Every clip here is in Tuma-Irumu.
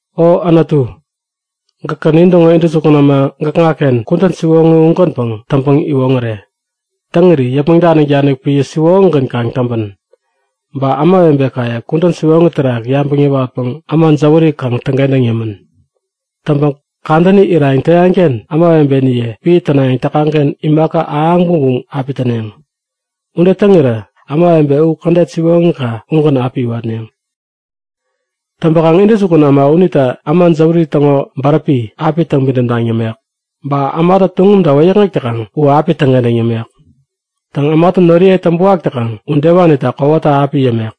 O Anutu, gäkä nintäŋo intäjukun äma gäkŋaken kudän siwoŋi ugänpäŋ täŋpäŋ-iwoŋäre. Täŋiri yäpmäŋ danik-danik piä siwoŋigän kaŋ täŋpän. Ba ämawebekaye kudän siwoŋi terak yabäŋ yäwatpäŋ äma jäwäri kaŋ täŋkentäŋ yämän. Täŋpäŋ kadäni irayäŋ täyakken ämawebeniye piä tänayäŋ täkaŋken imaka ahäŋ bumbum api täneŋ. Ude täŋirä ämawebe u kädet siwoŋika ugän api iwatneŋ. Täŋpäkaŋ intäjukun äma unitä äma jäwäri täŋo bäräpi api täŋpidäm taŋ yämek. Ba ämatä tuŋumta wäyäkŋek täkaŋ u api täŋkentäŋ yämek. Täŋ, ämatä noriye täŋpäwak täkaŋ udewanita kowata api yämek.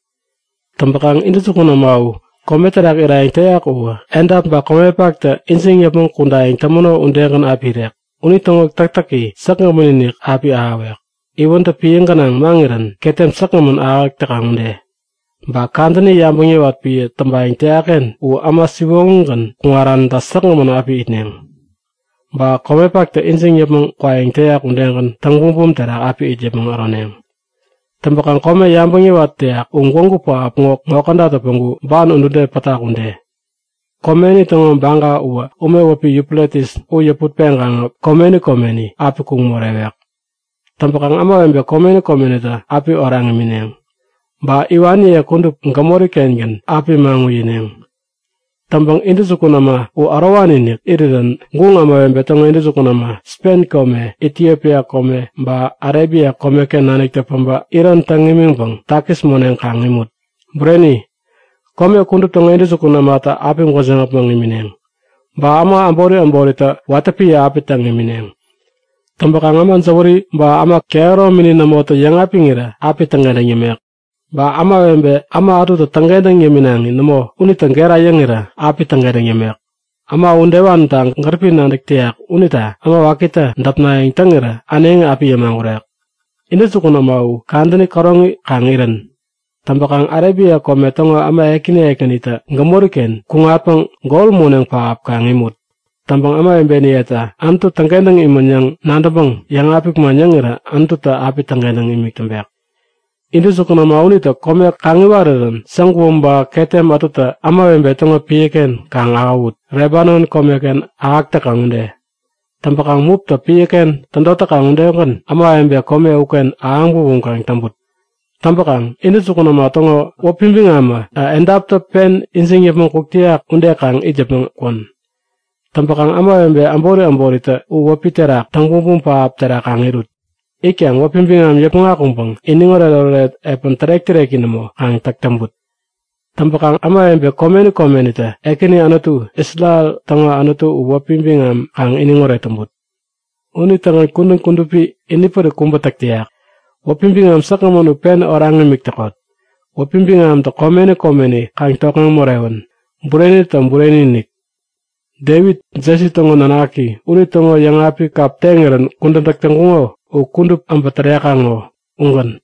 Täŋpäkaŋ intäjukun äma u kome terak irayäŋ täyak uwä edap ba komepaktä ijiŋ yäpmäŋ kudayäŋ tämäno udegän api irek. Unitäŋo täktäki säkgämän-inik api ahäwek, iwäntä piä gänaŋ maŋirän ketem säkgämän ahäk täkaŋ ude. Ba kadäni yabäŋ yäwat piä täŋpayäŋ täyakken u äma siwoŋigän kuŋaranitä säkgämän api itneŋ. Ba komepaktä ijiŋ yäpmäŋ kwayäŋ täyak udegän täŋ-bumbum terak api it yäpmäŋ äroneŋ. Täŋpäkaŋ kome yabäŋ yäwat täyak u gwägu pähap ŋo kädatä päŋku ban udude pätak ude. Komeni täŋo baga uwä ume wäpi Yufretis u yäput-peŋkaŋä komeni komeni api kuŋ morewek. Täŋpänkaŋ ämawebe komeni komenitä api oraŋ imineŋ. Ba iwaniye kudup gämori-kengän api maŋ uyineŋ. Täŋpäŋ intäjukun äma u ärowani-inik irirän guŋ ämawebe täŋo intäjukun äma Spen kome, Itiopia kome ba Arebia komeken naniktä päbä iron täŋ imiŋpäŋ takis moneŋ kaŋ imut. Bureni, kome kudup täŋo intäjukun ämatä api gwäjiŋ äpmoŋ imineŋ. Ba äma äbori äboritä watä piä api täŋ imineŋ. Täŋpäkaŋ äma jäwäri ba äma kehäromini nämotä yäŋapiŋirä api täŋkentäŋ yämek. Ba ämawebe äma ätutä täŋkentäŋ yäminaŋi nämo unitä gera yäŋirä api täŋkentäŋ yämek. Äma udewanita gäripi nadäk täyak unita äma wakitä däpnayäŋ täŋirä äneŋi api yämagurek. Intäjukun äma u kadäni käroŋi kaŋ irän! Täŋpäkaŋ Arebia kome täŋo äma ekäni ekänitä gämoriken kuŋatpäŋ gol moneŋ pähap kaŋ imut! Täŋpäŋ ämawebeniyetä Anutu täŋkentäŋ imän yäŋ nadäŋpäŋ yäŋapik man yäŋirä Anututä api täŋkentäŋ imik täŋpek. Intäjukun äma unitä kome kaŋ iwarirän saguom ba ketem ätutä ämawebe täŋo piäken kaŋ ahäwut, Lebanon komeken ahäk täkaŋ ude. Täŋpäkaŋ muptä piäken tädot täkaŋ udegän ämawebe kome uken ahäŋ bumbum kaŋ täŋput! Täŋpäkaŋ intäjukun äma täŋo wäpi biŋamä edaptä pen ijiŋ yäpmäŋ kuk täyak ude kaŋ it yäpmäŋ kwän. Täŋpäkaŋ ämawebe äbori äboritä u wäpi terak täŋ bumbum pähap terak kaŋ irut. Itkaŋ wäpi biŋam yäpmäŋ akuŋpäŋ iniŋoret-oret epän tärek-täreki nämo kaŋ täk täŋput. Täŋpäkaŋ ämawebe komeni komenitä Ekäni Anutu, Isrel täŋo Anutu u wäpi biŋam kaŋ iniŋoret täŋput. Unitägän kudän kudupi ini pärik kubä täk täyak. Wäpi biŋam säkgämän u pen oraŋ imik täkot. Wäpi biŋamtä komeni komeni kaŋ tokŋeŋ morewän! Burenitä bureni-inik! Devit, Jesi täŋo nanaki, unitäŋo yäŋapik kap teŋirän kudän täk täŋkuŋo u kudup äbä tärekaŋ ŋo. Ugän.